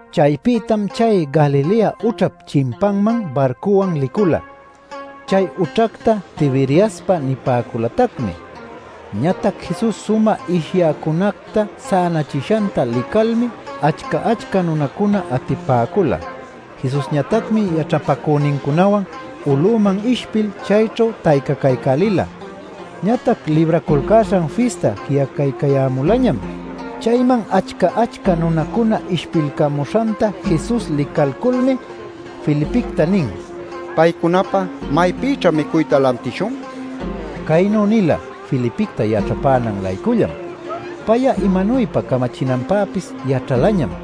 Chaypïtam chay Galilea ućhap chimpanman barcuwan licula. (Chay ućhacta Tiberiaspa nipäculatacmi.) Ñatac Jesus sumä ishyäcunacta sänachishanta licalmi achca-achca nunacuna atipäcula. Jesusñatacmi yaćhapacünincunawan uluman ishpil, chayćhu taycacaycälila. Ñatac Libraculcäśhan Fista ji'acaycayämulañam. Chayman achca-achca nunacuna ishpilcämuśhanta Jesus licalculmi, Felipicta nin: “¿Paycunapä maypïćha micuyta lantishun?” nil. Caynu nila Felipicta yaćhapänan-laycullam. Pay'a imanuypa camachinanpäpis yaćhalañam.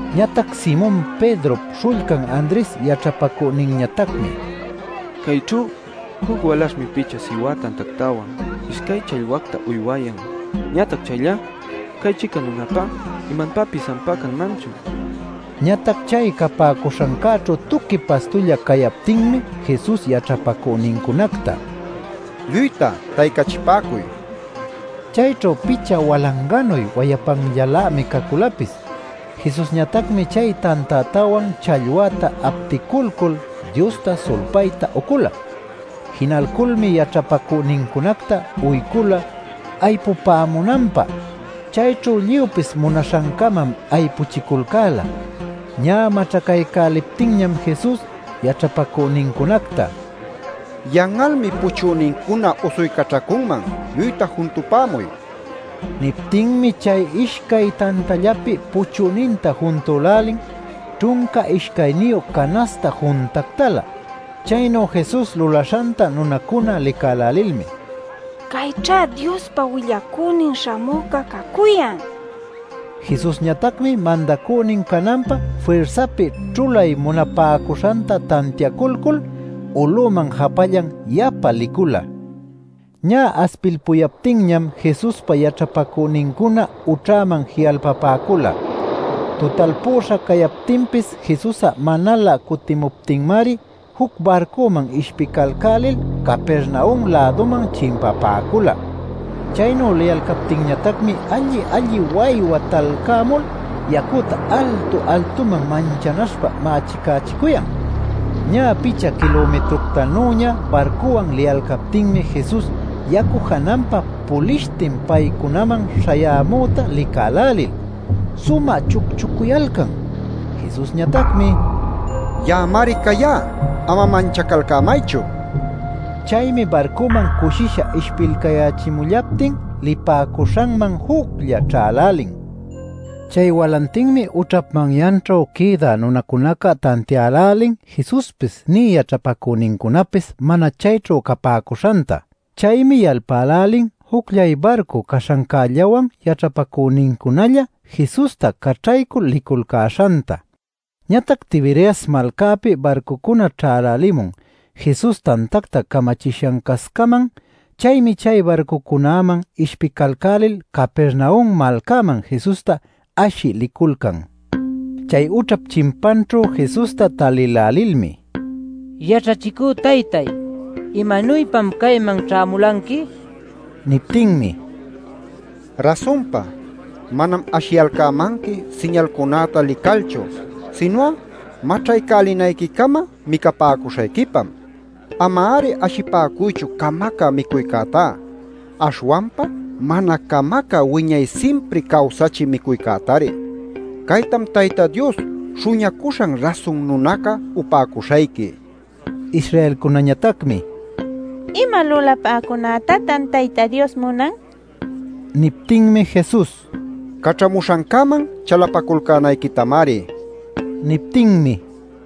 Ñatac Simon Pedrop śhullcan Andres yaćhapacüninñatacmi: “Cayćhu juc walaśhmi picha siwa tantactawan, ishcay challwacta uywayan. Ñatac chayllá ¿cay-chica nunapá imanpäpis ampá canmanchu?” nin. Ñatac chay capäcuśhancäćhu tuqui pastulla cayaptinmi Jesus yaćhapacünincunacta: “Lluyta taycachipäcuy” nin. Chayćhu picha walanganuy wayapanllanlämi caculapis. Jesusñatacmi chay tantätawan challwäta apticulcul Diosta sulpayta ucula. Jinalculmi yaćhapacünincunacta uycula aypupämunanpä. Chayćhu lluypis munaśhancamam aypuchiculcäla. Ñä maćhacaycäliptinñam Jesus yaćhapacünincunacta: “Yan'almi puchünincuna usuycaćhacunman; lluyta juntupämuy” nin. Niptinmi chay ishcay tantällapi puchüninta juntülälin, ćhunca ishcayniyu canaśhta juntactalä. Chaynu Jesus lulaśhanta nunacuna licälälilmi: “¡Cayćhá Diospa Willacünin Śhamüca cacuyan!” nicuyalcan. Jesusñatacmi mandacünin cananpä firsapi ćhulay munapäcuśhanta tantiaculcul uluman japallan yapa licula. Ñä aspilpuyaptinñam Jesuspa yaćhapacünincuna ućhäman ji'alpapäcula. Tutalpüśha cayaptinpis Jesus'a manalä cutimuptinmari juc barcuman ishpicalcälil Capernaum-läduman chimpapäcula. Chaynu liyalcaptinñatacmi alli-alli waywa talcämul yacüta altu-altuman manchanaśhpa mächicächicuyan. Ñä picha kilumitructanüña barcuwan liyalcalmi Jesus yacu jananpa pulishtin paycunaman śhayämüta licälälil sumä chucchucuyalcan. Jesusñatacmi: “¡Ya'amari cayá! ¡Ama manchacalcämaychu!” nin. Chaymi barcuman cushisha ishpilcayächimullaptin lipäcuśhanman juclla ćhälälin. Chay walantinmi ućhap manyanćhu quïdä nunacunaca tantiälälin Jesuspis nï yaćhapacünincunapis mana chayćhu capäcuśhanta. Chaymi yalpälälin jucllay barcu caśhancällawan yaćhapacünincunalla Jesusta caćhaycul liculcäśhanta. Ñatac Tiberias malcapi barcucuna ćhälälimun Jesus tantacta camachishancascaman. Chaymi chay barcucunäman ishpicalcälil Capernaum malcaman Jesusta ashï liculcan. Chay ućhap chimpanćhu Jesusta talïlälilmi: “Yaćhachicü taytay ¿imanuypam cayman ćhämulanqui?” nipäcun. Niptinmi: “Rasunpa, manam ashiyalcämanqui siñalcunäta licalchu, sinu'a maćhaycälinayquicama micapäcuśhayquipam. Ama-ari ashipäcuychu camacä micuycätá, aśhwanpa mana camacä wiñay simpri cawsachï micuycätari. Caytam Tayta Dios śhuñacuśhan Rasun Nunaca upäcuśhayqui” nin. Israelcunañatacmi: “¿Ima lulapäcunätatan Tayta Dios munan?” nipäcun. Niptinmi Jesus: “Caćhamuśhancäman chalapaculcänayquitamari” nin. Niptinmi: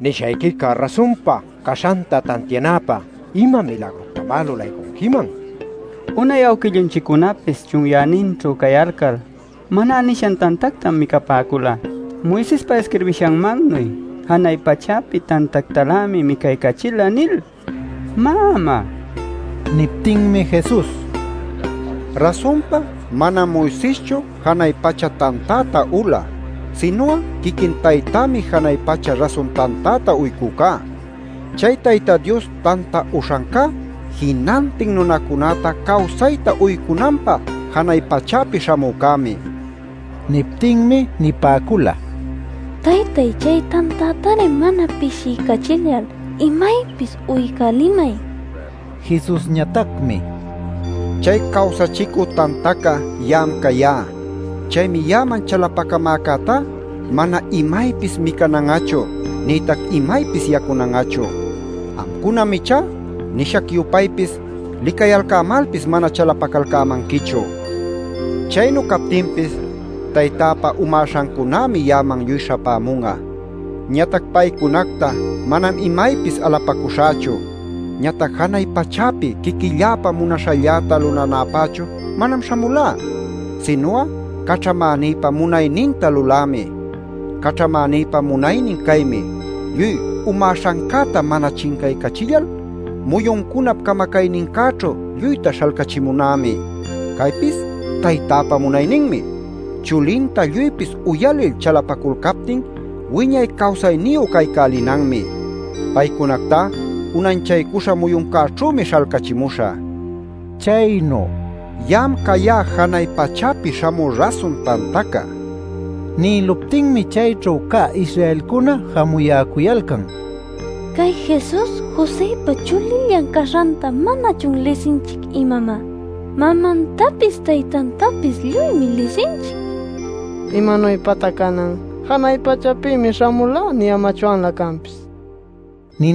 “Nishayquica rasunpa caśhanta tantianäpä ¿ima milagructamá lulaycunquiman? Unay awquillunchiccunapis chunyäninćhu cayalcal Maná nishan tantactam micapäcula, Moisespa isquirbishanmannuy: ‘Janay pachäpi tantactalämi micaycachila’ nil. Má, ¿am'a?” nicuyalcan. Niptinmi Jesus: “Rasunpa manam Moiseschu janay pacha tantäta ula sinu'a quiquin Taytämi janay pacha rasun tantäta uycücá. Chay Tayta Dios tanta uśhancá jinantin nunacunäta cawsayta uycunanpä janay pachäpi śhamücämi” nin. Niptinmi nipäcula: “Taytay, chay tantätari mana pishiycachillal imaypis uycälimay” nil. Jesusñatacmi: “Chay cawsachicü tantaca ya'am cayá. Chaymi ya'aman chalapacamäcätá mana imaypis micanan'achu, nïtac imaypis yacunan'achu. Amcunam ichá, nishac-yupaypis, licayalcämalpis mana chalapacalcämanquichu. Chaynu captinpis, Taytäpa umäśhancunämi ya'aman lluy śhapämun'a. Ñatac paycunacta manam imaypis alapacuśhächu. Ñatac janay pachäpi quiquilläpa munaśhalläta lulanäpächu manam śhamulá, sinu'a caćhamänïpa munayninta lulämi. Caćhamänïpa munaynin caymi: lluy umäśhancäta mana chincaycachillal muyuncunap camacaynincäćhu lluyta śhalcachimunämi. Caypis Taytäpa munayninmi: chulinta lluypis uyalil chalapaculcaptin wiñay cawsayniyu caycälinanmi. Paycunactá unanchaycuśha muyuncäćhümi śhalcachimuśhä” nin. Chaynu “Ya'am cayá janay pachäpi śhamü rasun tantaca” nïluptinmi chayćhu cä Israelcuna jamuyäcuyalcan: “Cay Jesus Josëpa chulillan caśhanta ¿manachun lisinchic, imamá? Mamantapis, taytantapis lluymi lisinchic. ¿Imanuypatá canan ‘janay pachapïmi śhamulá’ niyämachwanlä canpis?” nil.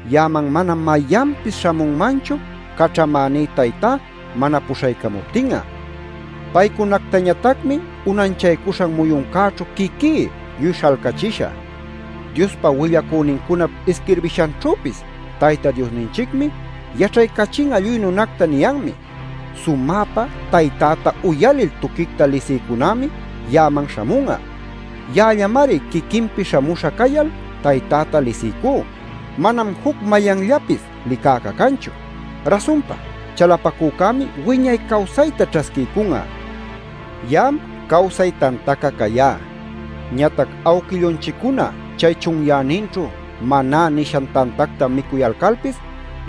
Ya'aman manam mayanpis śhamunmanchu caćhamäní Taytá mana puśhaycamuptin'a. Paycunactañatacmi unanchaycuśhan muyuncäćhu quiquí lluy śhalcachishä. “Diospa willacünincunap isquirbishanćhüpis ‘Tayta Diosninchicmi yaćhaycachin'a lluy nunacta’ niyanmi. Sumäpa taytäta uyalil tuquicta lisïcunämi ya'aman śhamun'a. Ya'allamari quiquinpi śhamuśha cayal taytäta lisiycú; manam juc mayanllapis licäca canchu. Rasunpa chalapacücämi wiñay cawsayta ćhasquiycun'a. “Ya'am cawsay tantaca cayá. Ñatac awquillunchiccuna chay chunyäninćhu Maná nishan tantacta micuyalcalpis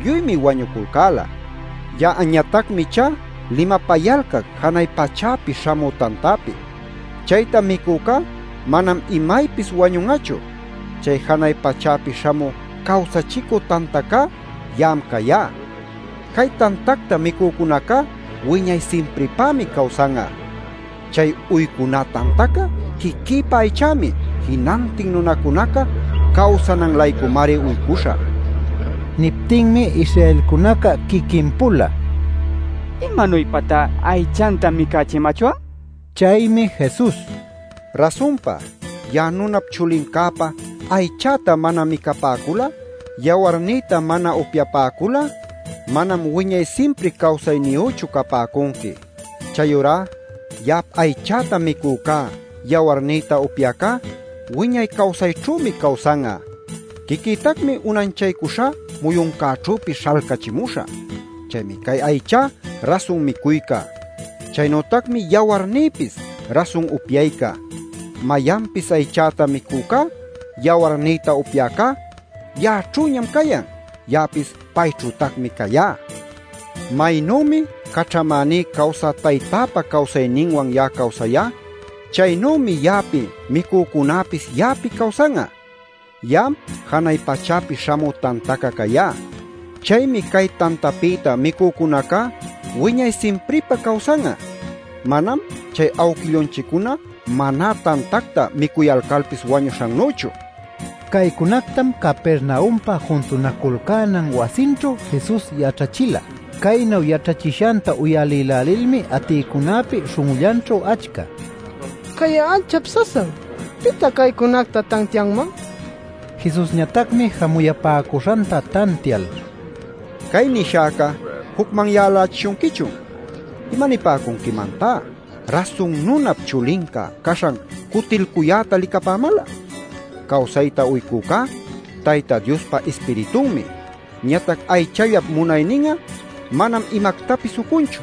lluymi wañuculcäla. Ya'añatacmi ichá limapayalcac janay pachäpi śhamü tantapi. Chayta micücá manam imaypis wañun'achu. Chay janay pachäpi śhamü cawsachicü tantacá ya'am cayá. Cay tantacta micücunacá wiñay simpripämi cawsan'a. Chay uycuná tantaca quiquïpa aychämi. Jinantin nunacunaca cawsanan-laycumari uycuśhä” nin. Niptinmi Israelcunaca quiquin-pula “¿Imanuypatá aychanta micächimachwan?” ninacücuyalcan. Chaymi Jesus: “Rasunpa ya'a Nunap Chulincäpa aychäta mana micapäcul'a, yawarnïta mana upyapäcul'a, manam wiñay simpri cawsayniyüchu capäcunqui. Chayurá ya'ap aychäta micücá yawarnïta upyäcá wiñay cawsayćhümi cawsan'a. Quiquïtacmi unanchaycuśhá muyuncäćhüpis śhalcachimuśhä. Chaymi cay aychá rasun micuyca. Chaynütacmi yawarnïpis rasun upyayca. Mayanpis aychäta micücá, yawarnïta upyäcá ya'aćhüñam cayan. Ya'apis payćhütacmi cayá. Maynümi caćhamäní cawsä Taytäpa cawsayninwan ya'a cawsayá, chaynümi ya'api micücunäpis ya'api cawsan'a. Ya'am janay pachäpi śhamü tantaca cayá. Chaymi cay tantapïta micücunacá wiñay simpripä cawsan'a. Manam chay awquillunchiccuna Maná tantacta micuyalcalpis wañuśhannüchu” nin. Caycunactam Capernaumpa juntunaculcänan wasinćhu Jesus yaćhachila. Caynu yaćhachishanta uyalïlälilmi atïcunäpi śhun'ullanćhu achca “Cay'a anchap sasam. ¿Pitá caycunacta tantianman?” nipäcula. Jesusñatacmi jamuyapäcuśhanta tantial: “¿Cay nishäca jucmanyalächishunquichun? ¿Imanipäcunquimantá Rasun Nunap Chulinca caśhan cutilcuyäta licapämal'a? Cawsayta uycücá Tayta Diospa Ispiritunmi; ñatac aychallap munaynin'a manam imactapis ucunchu.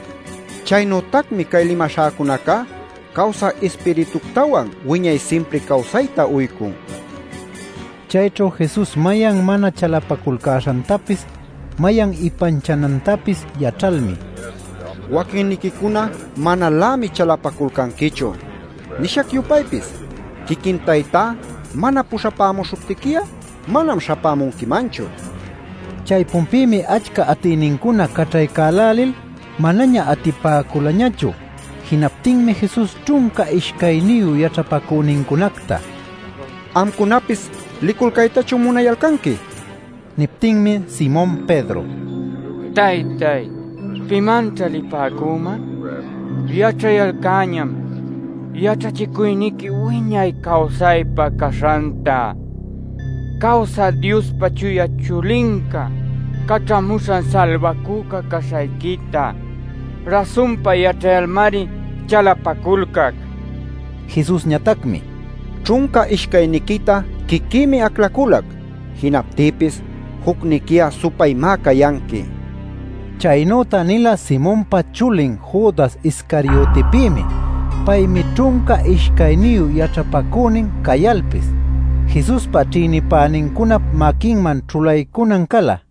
Chaynütacmi cay limaśhäcunacá cawsä ispirituctawan wiñay simpri cawsayta uycun” nin. Chayćhu Jesus mayan mana chalapaculcäśhantapis, mayan ipanchanantapis yaćhalmi: “Waquinniquicuna manalämi chalapaculcanquichu. Nishac-yupaypis quiquin Taytá mana puśhapämuśhuptiqui'a manam śhapämunquimanchu” nin. Chaypunpïmi achca atïnincuna caćhaycälälil manaña atipäculañachu. Jinaptinmi Jesus ćhunca ishcayniyu yaćhapacünincunacta: “¿Amcunapis liculcaytachun munayalcanqui?” nin. Niptinmi Simon Pedro: “¿Taytay, pimanćhá lipäcüman? Yaćhayalcäñam yaćhachicuyniqui wiñay cawsaypä caśhanta. Cawsä Diospa Chuya chulinca, Caćhamuśhan Salbacüca caśhayquita rasunpa yaćhayalmari chalapaculcac” nin. Jesusñatacmi: “Ćhunca ishcayniquita quiquïmi aclaculac. Jinaptïpis jucniqui'a supaymá cayanqui” nin. Chaynüta nila Simonpa chulin Judas Iscariotipïmi. Paymi ćhunca ishcayniyu yaćhapacünin cayalpis Jesuspa ćhïnipänincunap maquinman ćhulaycunan cala.